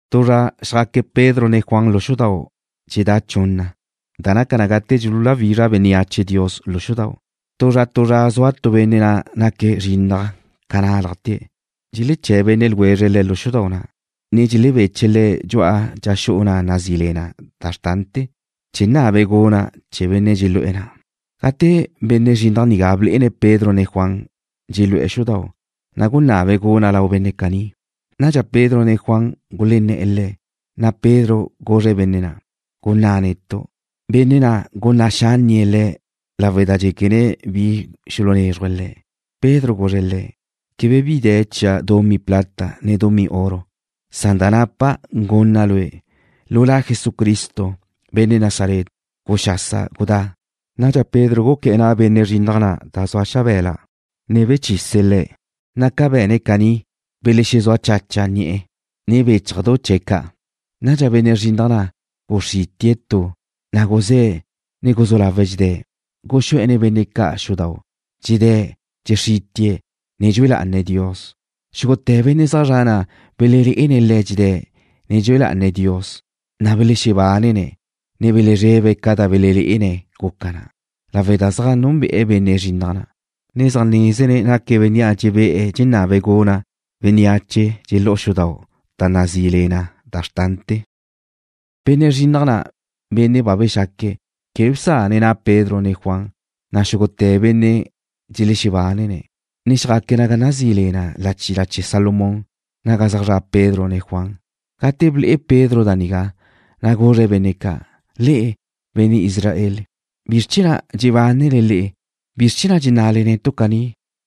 Tu zra xjaque̱' Pedro ne Juan lu xudau' dxexedá' chunna, da naca na gate dxululáwizraj bénneache Dios lu xudau'. Tu zra tu zra zua tu benne' na' naque̱' zrinnaj ca nálajte̱'. Dxeleché̱' benne' ljwezre̱' le̱' xudau' na', ne dxelebeche̱' le̱' dxu'a dxa xu'u na' nazí le na: Da Xrtante̱, chee̱ nabe̱' guna' chee̱ benne' dxelu'e̱ na'. Gate benne' zrinnaj nigá blé'ene̱' Pedro ne Juan, dxelu'e̱ xudau', na' gunabe̱' guna' lau benne' caní. Nadxa Pedro ne Juan gulenné̱'e̱ le̱', na' Pedro guzre̱' benne' na': ―Gunná' netu'. Benne' na' gunná' xánnie̱' le̱' lawe' da dxéquene̱' bi xulunezruje̱' le̱'. Pedro guzre̱' le̱': ―Quebe bi de̱ chia' dumí plata ne dumí oro. Da napa' gunna' lue'. Lu La Jesucristo, benne' Nazaret, guxasa gudá. Nadxa Pedro guqué̱'e̱ na' benne' zrinnaj na' da zua xabe̱la, ne bechise̱' le̱', na' ca be̱ne̱' caní, belexezúa chacha ni'e̱, ne béchajdu chee̱' ca'. Nadxa benne' zrinnaj na' guxrítie̱' tu, na' guzé̱', ne guzú lawe̱' dxedé̱'. Guxú'e̱ nen benne' ca' xudau', dxedé̱', dxexrítie̱', ne dxue lá'ane̱' Dios. Xúgute̱ benne' zaj zre̱'e̱ na' belelé'ene̱' le̱' dxedé̱', ne dxue lá'ane̱' Dios. Belexebánene̱', ne belezrebe̱' ca da belelé'ene̱' guca na, lawe' da zaj núnbe'e̱ benne' zrinnaj na', ne zaj nézene̱' naque̱' bénnea' dxebé'e̱ dxenabe̱' guna' ga dxelexú'u bénneache xudau', da na' nazí le na Da Xrtante̱. Benne' zrinnaj na', benne' ba bexaque̱', quebe bsane̱' na' Pedro ne Juan, na' xúgute̱ benne' dxelexebánene̱', ne xjaque̱' naga nazí le na La Chila Chee̱ Salomón, naga zaj zra' Pedro ne Juan. Gate ble'e Pedro da nigá, na' guzre̱' benne' ca': ―Le'e, benne' Israel, ¿bizr chee̱ na' dxebánele le'e? ¿Bizr chee̱ na' dxenná'le netu' caní,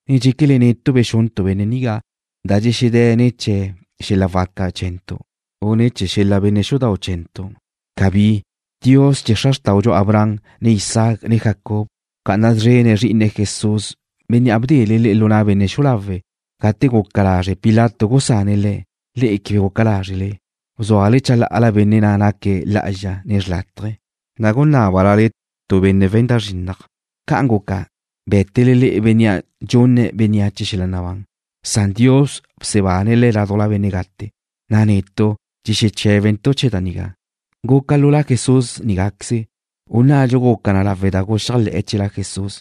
ne dxéquele netu' bexuntu' benne' nigá, na' dxexedé̱' ne̱ chee̱ xel-la' waca chee̱ntu', u ne̱ chee̱ xel-la' benne' xudau' chee̱ntu'? ¡Cabí! Dios chee̱ xra xrtáudxu Abraham, ne Isaac, ne Jacob bca'ana szrene̱' Zrí'ine̱', Jesús, Bénnea' bdele le'e lu na' benne' xu'u lawe'. Gate guca lazre' Pilato gusane̱' Le̱', le'e quebe guca lázrele. Bzúale chalá'ala Benne' na' naque̱' lá'azxa ne xrlátaje, na' gunábale la tu benne' we̱n da zrinnaj. Ca'an guca, bé̱tele le'e Bénnea' dxunne̱' bénneache xel-la' nabán, san Dios bsebane̱' Le̱' ládujla benne' gate, na' netu' dxexeché̱bentu' chee̱ da nigá. Guca lu La Jesús nigáqueze, u nnadxu guca na lawe' da guxéajle̱ chee̱ La Jesús,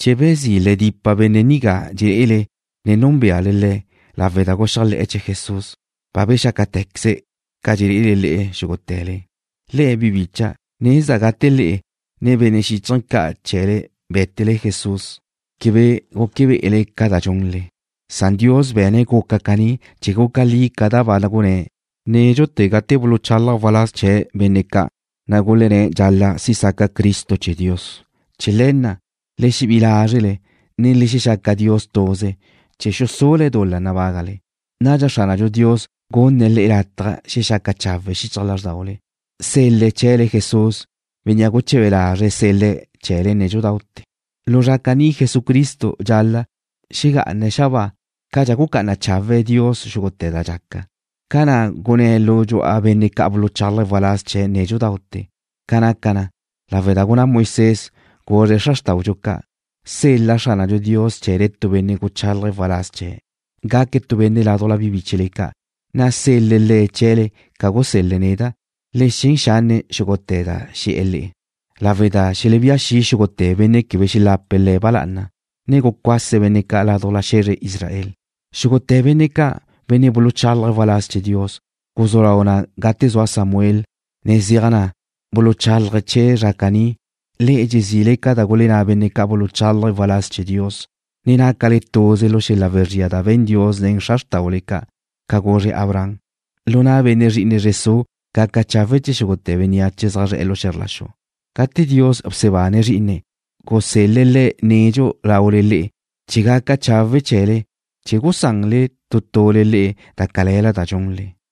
chee̱ bezí' le dipa benne' nigá dxelé'ele, ne núnbeale le̱'. Lawe' da guxéajle̱'e̱ chee̱ Jesús, ba bexácate̱queze̱' ca dxelé'ele le'e xúgute̱le. ’Le'e, Bi bicha', nezda' gate le'e, ne benne' xíchaje̱ ca' chee̱le bé̱tele Jesús, quebe guque be'ele ca da dxunle. Dios be̱ne̱' guca caní chee̱ guca li ca da ba gunné̱' nédxute̱ gate buluchalaj waláz chee̱' benne' ca', na' gulenné̱' dxal-la' si' saca Cristo chee̱ Dios. Chee̱ le̱ na', le xebí'i lázrele, ne le xexaca Dios tuze, chee̱ xusule̱' dul-la nabágale. Nadxa Xránadxu Dios gunne̱' le'e lataj xexaca chawe' xichaj lázrdaule. Sel-le̱' chee̱le Jesús, Bénnea' guche̱be lazre̱' sel-le̱' chee̱le nédxudaute̱. Lu zra caní Jesucristo dxal-la' xegá'ane̱' xabáa cadxa gucá'ana chawe' Dios xúgute̱ da dxaca, ca na' gunné̱' lu dxu'a benne' ca' buluchálaje̱' waláz chee̱' nédxudaute̱. Ca' naca na, lawe' da gunná Moisés, guzre̱' xra xrtáudxu ca': “Sel-la Xránadxu Dios chee̱le tu benne' guchálaje̱' waláz chee̱'. Gaque̱' tu benne' ládujla bi bíchele ca', na' sel-le̱' le̱' chee̱le ca gusel-le̱' neda'. Le xen xanne' xúgute̱ da xe̱'e̱ le'e, lawe' da welebía xi' xúgute̱ benne' quebe xelapa Le̱' ba lá'ana, na' cuase̱' benne' ca' ládujla xe̱zre Israel.” ’Xúgute̱ benne' ca', benne' buluchálaje̱' waláz chee̱ Dios, guzú lau na gate zua Samuel, ne zeaj na, buluchálaje̱' chee̱ zra caní. Le'e dxezile ca da gulenná benne' ca' buluchálaje̱' waláz chee̱ Dios, ne nácale tuze lu xel-la' wezría da be̱n Dios nen xra xrtáule ca', ca guzre̱' Abraham: “Lu na' benne' zri'ine zre su' gaca chawe' chee̱ xúgute̱ bénneache zaj zre̱'e̱ lu xe̱zr la xu.” Gate Dios bsebane̱' Zrí'ine̱', gusel-le̱' Le̱' nedxu laule le'e chee̱ gaca chawe' chee̱le, chee̱ gusanle tu tule le'e da cale̱la da dxunle.